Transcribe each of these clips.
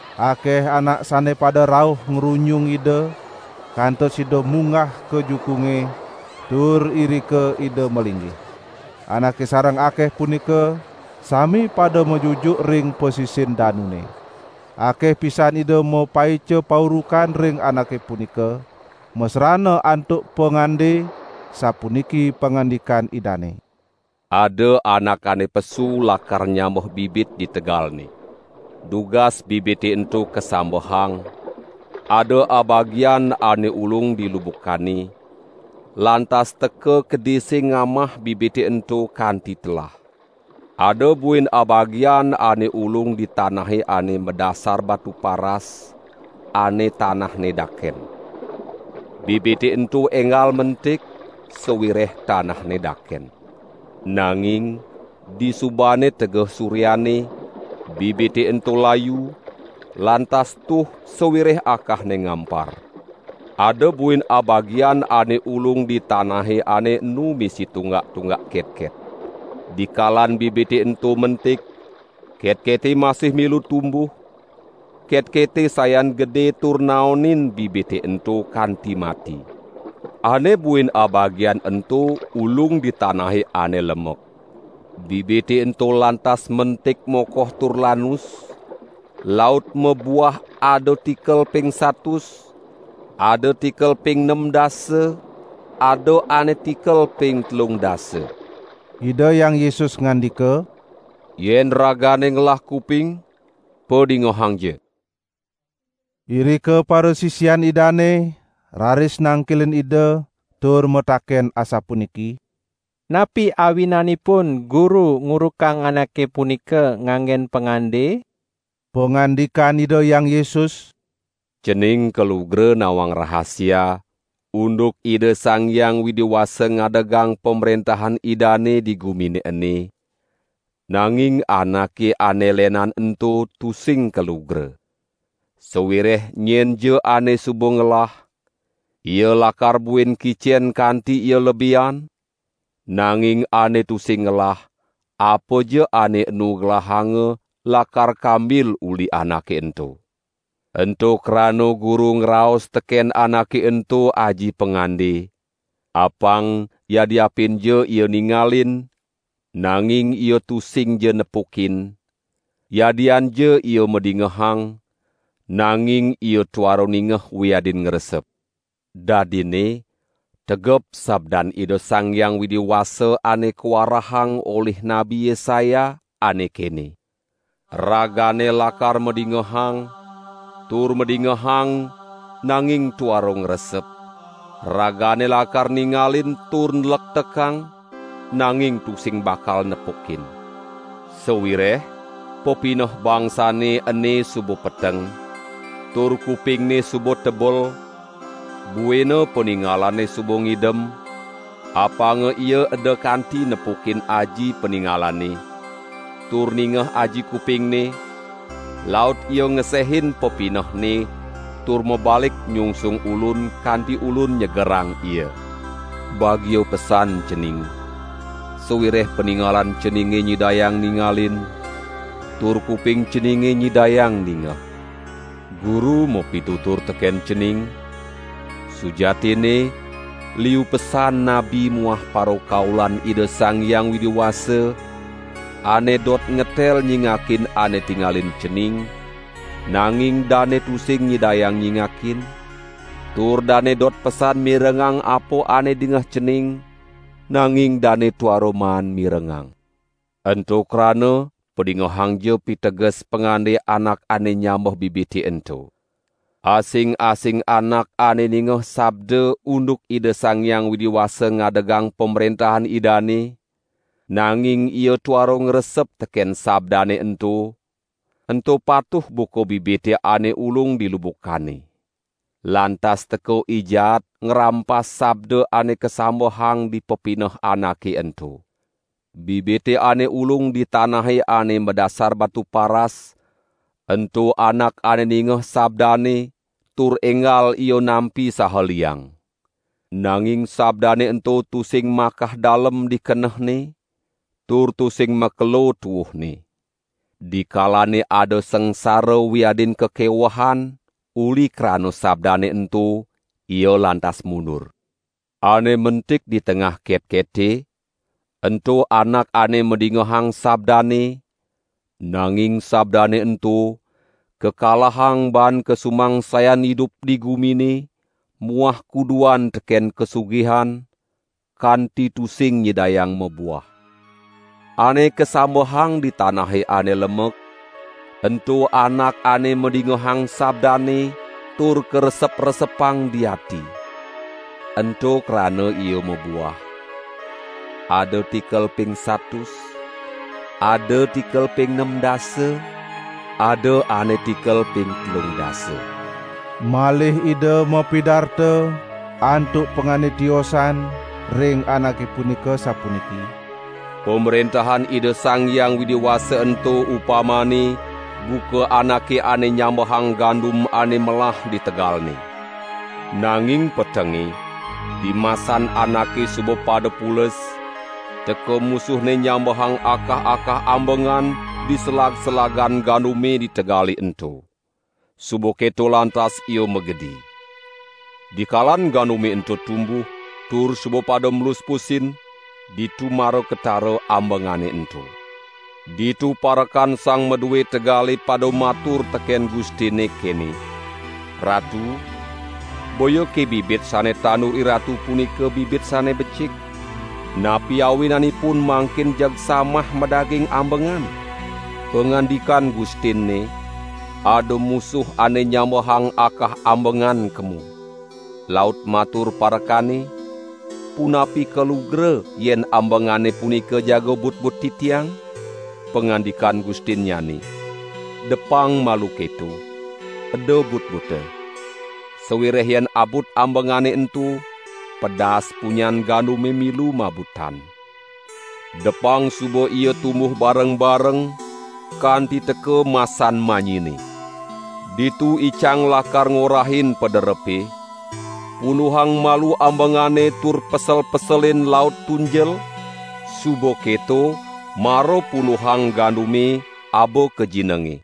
Akeh anak sane pada rauh ngrunyung Ida, kantos Ida munggah ka jukunge, tur irika Ida malinggih. Anake sareng akeh punika sami pada majujuk ring pasisin danune. Akeh pisan Ida mapaica paurukan ring anake punika, masrana antuk pangande, sapuniki pangandikan Idane: "Ada anak ane pesu lakar nyambeh bibit di tegalne. Dugas bibite ento kasambehang, ada abagian ane ulung di lubukane, lantas teka kedise ngamah bibite ento kanti telah. Ada buin abagian ane ulung di tanahe ane madasar batu paras, ane tanahne daken. Bibite ento enggal mentik, sawireh tanahne daken. Nanging disubane tegeh suryane, bibite ento layu, lantas tuh sawireh akahne ngampar. Ada buin abagian ane ulung di tanahe ane enu misi tunggak-tunggak ketket. Dikalan bibite ento mentik, ketkete masih milu tumbuh, ketkete sayan gede tur naonin bibite ento kanti mati. Ane buin abagian ento ulung di tanahe ane lemek. Bibite ento lantas mentik mokoh tur lanus, laut mabuah ada tikel ping satus, ada tikel ping nem dasa, ada ane tikel ping telung dasa." Ida Hyang Yesus ngandika: "Yen ragane ngelah kuping, padingehangja!" Irika parasisian Idane raris nangkilin Ida tur mataken asapuniki: "Napi awinanipun Guru ngurukang anake punika nganggen pangande?" Pangandikan Ida Hyang Yesus: "Cening kalugra nawang rahasia unduk Ida Sang Hyang Widi Wasa ngadegang Pamrentahan Idane di gumine ene, nanging anake ane lenan ento tusing kalugra. Sawireh nyenja ane suba ngelah, ia lakar buin kicen kanti ia lebihan, nanging ane tusing ngelah apaja ane enu gelahanga lakar kambil uli anake ento. Ento krana Guru ngraos teken anake ento aji pangande: Apang yadiapinja ia ningalin, nanging ia tusingja nepukin, yadianja ia madingehang, nanging ia tuara ningeh wiadin ngresep. Dadinne tegep sabdan Ida Sang Hyang Widi Wasa ane kawarahang olih Nabi Yesaya, ane kene: Ragane lakar madingehang, tur madingehang nanging tuara ngresep, ragane lakar ningalin tur nlektekang, nanging tusing bakal nepukin. Sawireh pepineh bangsane ene suba peteng, tur kupingne suba tebel, buina paningalane suba ngidem, apanga ia eda kanti nepukin aji paningalane, tur ningeh aji kupingne, laut ia ngesehin pepinehne tur mabalik nyungsung Ulun kanti Ulun nyegerang ia.' Bagia pesan cening, sawireh paningalan ceninge nyidayang ningalin tur kuping ceninge nyidayang ningeh. Guru mapitutur teken cening: Sujatinne liu pesan nabi muah parakaulan Ida Sang Hyang Widi Wasa ane dot ngetel nyingakin ane tingalin cening, nanging dane tusing nyidayang nyingakin, tur dane dot pesan mirengang apa ane dingeh cening, nanging dane tuara maan mirengang." "Ento krana padingehangja piteges pangande anak ane nyambeh bibite ento. Asing-asing anak ane ningeh sabda unduk Ida Sang Hyang Widi Wasa ngadegang pamrentahan Idane, nanging ia tuara ngresep teken sabdane ento, ento patuh buka bibite ane ulung di lubukane. Lantas teka I Jaat ngrampas sabda ane kasambehang di pepineh anake ento. Bibite ane ulung di tanahe ane madasar batu paras, ento anak ane ningeh sabdane tur enggal ia nampi saha liang. Nanging sabdane ento tusing makah dalem di kenehne, tur tusing makelo tuuhne. Dikalane ada sangsara wiadin kakewehan uli krana sabdane ento, ia lantas mundur. Ane mentik di tengah ketkete, ento anak ane madingehang sabdane, nanging sabdane ento kakalahang baan kasumangsayan idup di gumine muah kuduan teken kasugihan, kanti tusing nyidayang mabuah. Ane kasambehang di tanahe ane lemek, ento anak ane madingehang sabdane tur karesep-resepang di ati. Ento krana ia mabuah, ada tikel ping satus, ada tikel ping nem dasa ada ane tikel ping telung dasa." Malih Ida mapidarta antuk pangande tiosan ring anake punika sapuniki: "Pamrentahan Ida Sang Hyang Widi Wasa ento upamane buka anake ane nyambehang gandum ane melah di tegalne. Nanging petenge, dimasan anake suba pada pules, teka musuhne nyambehang akah-akah ambengan di selag-selagan gandume di tegale ento. Suba keto lantas ia magedi. Dikalan gandume ento tumbuh, tur suba pada mluspusin, ditu mara ketara ambengane ento. Ditu parekan sang madue tegale pada matur teken gustinne kene: 'Ratu boyake bibit sane tandur iratu punika bibit sane becik? Napi awinanipun mangkin jeg samah madaging ambengan?' Pangandikan gustinne: 'Ada musuh ane nyambehang akah ambengan kemo.' Laut matur parekane: 'Punapi kalugra yen ambengane punika jaga butbut titiang?' Pangandikan gustinnyane: 'Depang malu keto, eda butbuta, sawireh yen abut ambengane ento, pedas punyan gandume milu mabutan. Depang suba ia tumbuh bareng-bareng, kanti teka masan manyine. Ditu icang lakar ngorahin paderepe: 'Punduhang malu ambengane tur pesel-peselin laut tunjel, suba keto mara punduhang gandumne aba ka jinenge!' "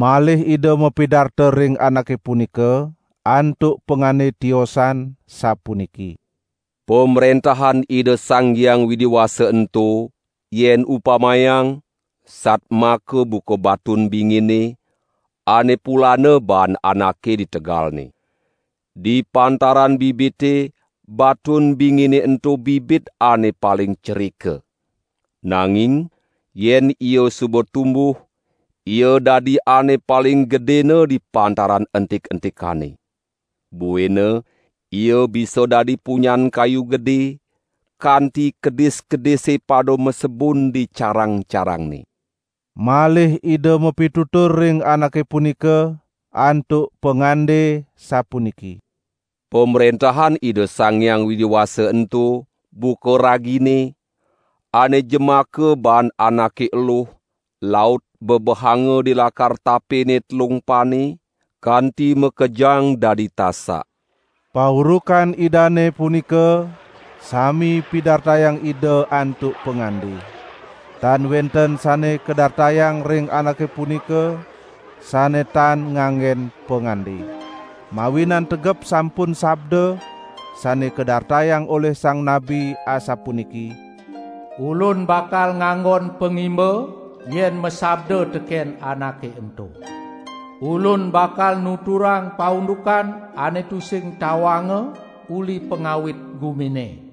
Malih Ida mapidarta ring anake punika antuk pangande tiosan, sapuniki: "Pamrentahan Ida Sang Hyang Widi Wasa ento yen upamayang satmaka buka batun bingine, ane pulana baan anake di tegalne. Di pantaran bibite, batun bingine ento bibit ane paling cerika! Nanging yen ia suba tumbuh, ia dadi ane paling gedena di pantaran entik-entikane. Buina ia bisa dadi punyan kayu gede, kanti kedis-kedise pada masebun di carang-carangne." Malih Ida mapitutur ring anake punika antuk pangande sapuniki: "Pamrentahan Ida Sang Hyang Widi Wasa ento buka ragine, ane jemaka baan anake eluh laut bebehanga di lakar tapene telung pane kanti makejang dadi tasak." Paurukan Idane punika sami pidartayang Ida antuk pangande. Tan wenten sane kadartayang ring anake punika sane tan nganggen pangande. Mawinan tegep sampun sabda sane kadartayang olih sang nabi asapuniki: "Ulun bakal nganggon pangimba yen masabda teken anake ento. Ulun bakal nuturang paundukan ane tusing tawanga uli pangawit gumine."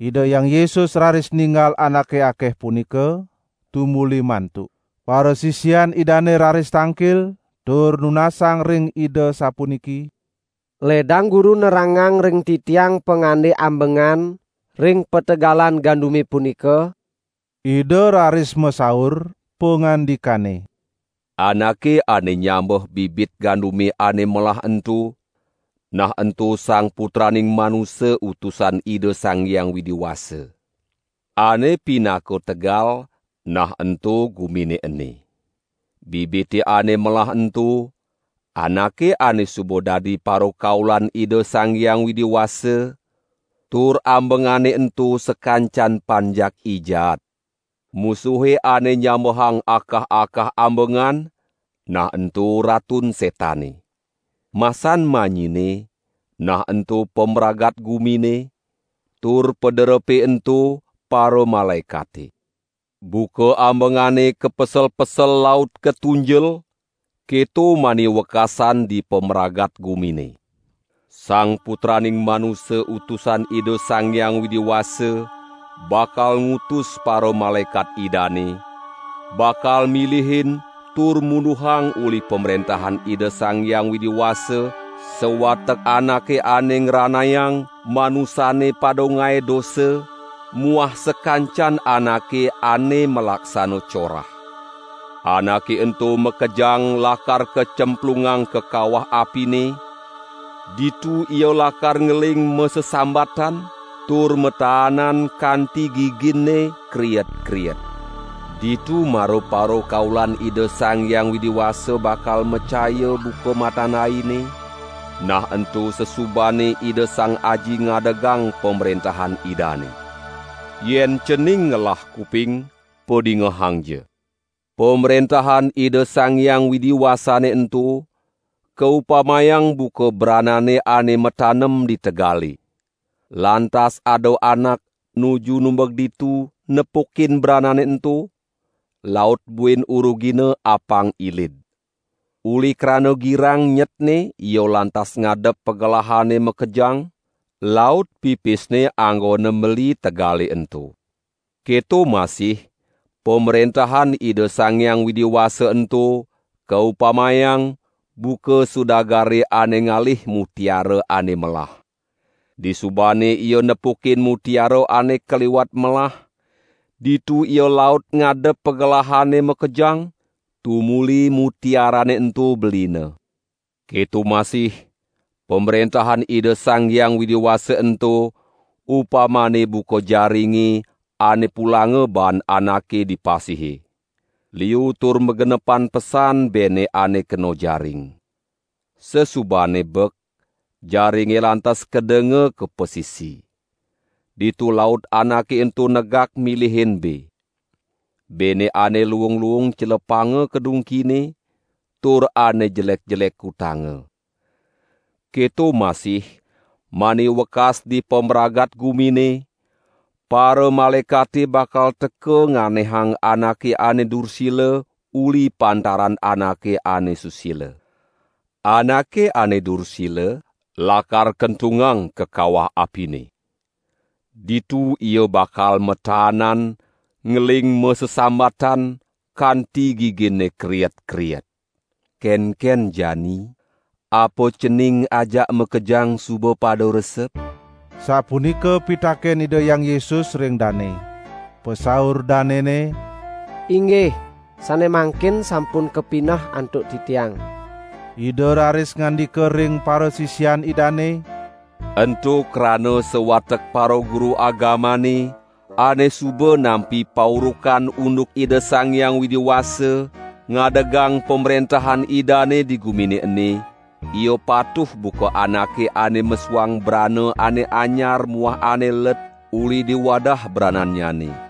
Ida Hyang Yesus raris ninggal anake akeh punika, tumuli mantuk. Parasisian Idane raris tangkil tur nunasang ring Ida sapuniki: "Ledang Guru nerangang ring titiang pangande ambengan ring pategalan gandume punika." Ida raris masaur, pangandikane: "Anake ane nyambeh bibit gandume ane melah ento, nah ento Sang Putraning Manusa Utusan Ida Sang Hyang Widi Wasa. Ane pinaka tegal, nah ento gumine ene. Bibite ane melah ento, anake ane suba dadi parakaulan Ida Sang Hyang Widi Wasa, tur ambengane ento sakancan panjak I Jaat. Musuhe ane nyambehang akah-akah ambengan, nah ento Ratun Setane. Masan manyine, nah ento pamragat gumine, tur paderepe ento paramalaekate. Buka ambengane kapesel-pesel laut katunjel, keto mani wekasan di pamragat gumine. Sang Putraning Manusa Utusan Ida Sang Hyang Widi Wasa bakal ngutus paramalaekat Idane, bakal milihin tur munduhang uli Pamrentahan Ida Sang Hyang Widi Wasa sawatek anake ane ngranayang manusane pada ngae dosa muah sakancan anake ane malaksana corah. Anake ento makejang lakar kacemplungang ka kawah apine, ditu ia lakar ngeling masesambatan tur mataanan kanti giginne kriet-kriet. Ditu mara parakaulan Ida Sang Hyang Widi Wasa bakal macaya buka matan aine, nah ento sasubane Ida Sang Aji ngadegang Pamrentahan Idane. Yen cening ngelah kuping, padingehangja!" "Pamrentahan Ida Sang Hyang Widi Wasane ento kaupamayang buka branane ane matanem di tegale. Lantas ada anak nuju numbeg ditu nepukin branane ento, laut buin urugine apang ilid. Uli krana girang nyetne ia lantas ngadep pagelahane makejang, laut pipisne anggone meli tegale ento." "Keto masih Pamrentahan Ida Sang Hyang Widi Wasa ento kaupamayang buka sudagare ane ngalih mutiara ane melah. Disubane ia nepukin mutiara ane kaliwat melah, ditu ia laut ngadep pagelahane makejang tumuli mutiarane ento belina." "Keto masih Pamrentahan Ida Sang Hyang Widi Wasa ento upamane buka jaringe ane pulanga baan anake di pasihe. Liu tur magenepan pesan bene ane kena jaring. Sasubane bek, jaringe lantas kedenga ka pasisi. Ditu laut anake ento negak milihin be. Bene ane luung-luung celepanga ka dungkine, tur ane jelek-jelek kutanga. Keto masih mani wekas di pamragat gumine; paramalaekate bakal teka nganehang anake ane dursila uli pantaran anake ane susila. Anake ane dursila lakar kentungang ka kawah apine. Ditu ia bakal mataanan ngeling masesambatan kanti giginne kriet-kriet." "Kenken jani, apa cening ajak makejang suba pada resep?" sapunika pitaken Ida Hyang Yesus ring dane. Pasaur danene: "Inggih, sane mangkin sampun kapineh antuk titiang." Ida raris ngandika ring parasisian Idane: "Ento krana sawatek paraguru agamane ane suba nampi paurukan unduk Ida Sang Hyang Widi Wasa ngadegang Pamrentahan Idane di gumine ene, ia patuh buka anake ane mesuang brana ane anyar muah ane let uli di wadah branannyane."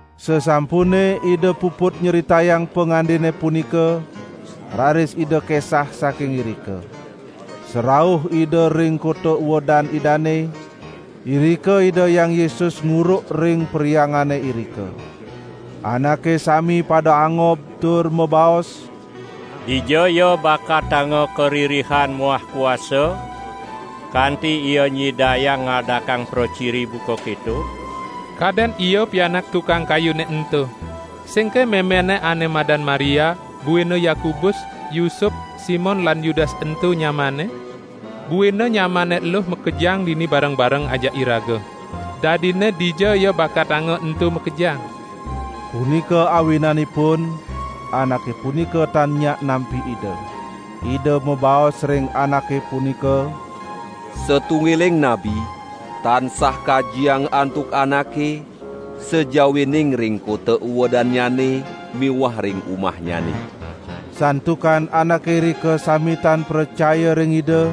Sasampune Ida puput nyritayang pangandene punika, raris Ida kesah saking irika. Sarauh Ida ring kota uedan Idane, irika Ida Hyang Yesus nguruk ring perhyangane irika. Anake sami pada angob tur mabaos: "Dijaya bakatanga karirihan muah kuasa kanti Ia nyidayang ngadakang praciri buka keto? Kaden Ia pianak tukang kayune ento? Singke memenNe ane madan Maria, buina Yakobus, Yusup, Simon lan Yudas ento nyamanNe? Buina nyamanNe eluh makejang dini bareng-bareng ajak iraga? Dadinne dijaya bakatanga ento makejang?" Punika awinanipun anake punika tan nyak nampi Ida. Ida mabaos ring anake punika: "Satunggiling nabi, tansah kajiang antuk anake sajawining ring kota uedannyane miwah ring umahnyane." Santukan anake irika sami tan pracaya ring Ida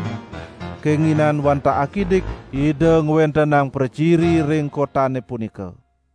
kenginan wantah akidik Ida ngwentenang praciri ring kotane punika.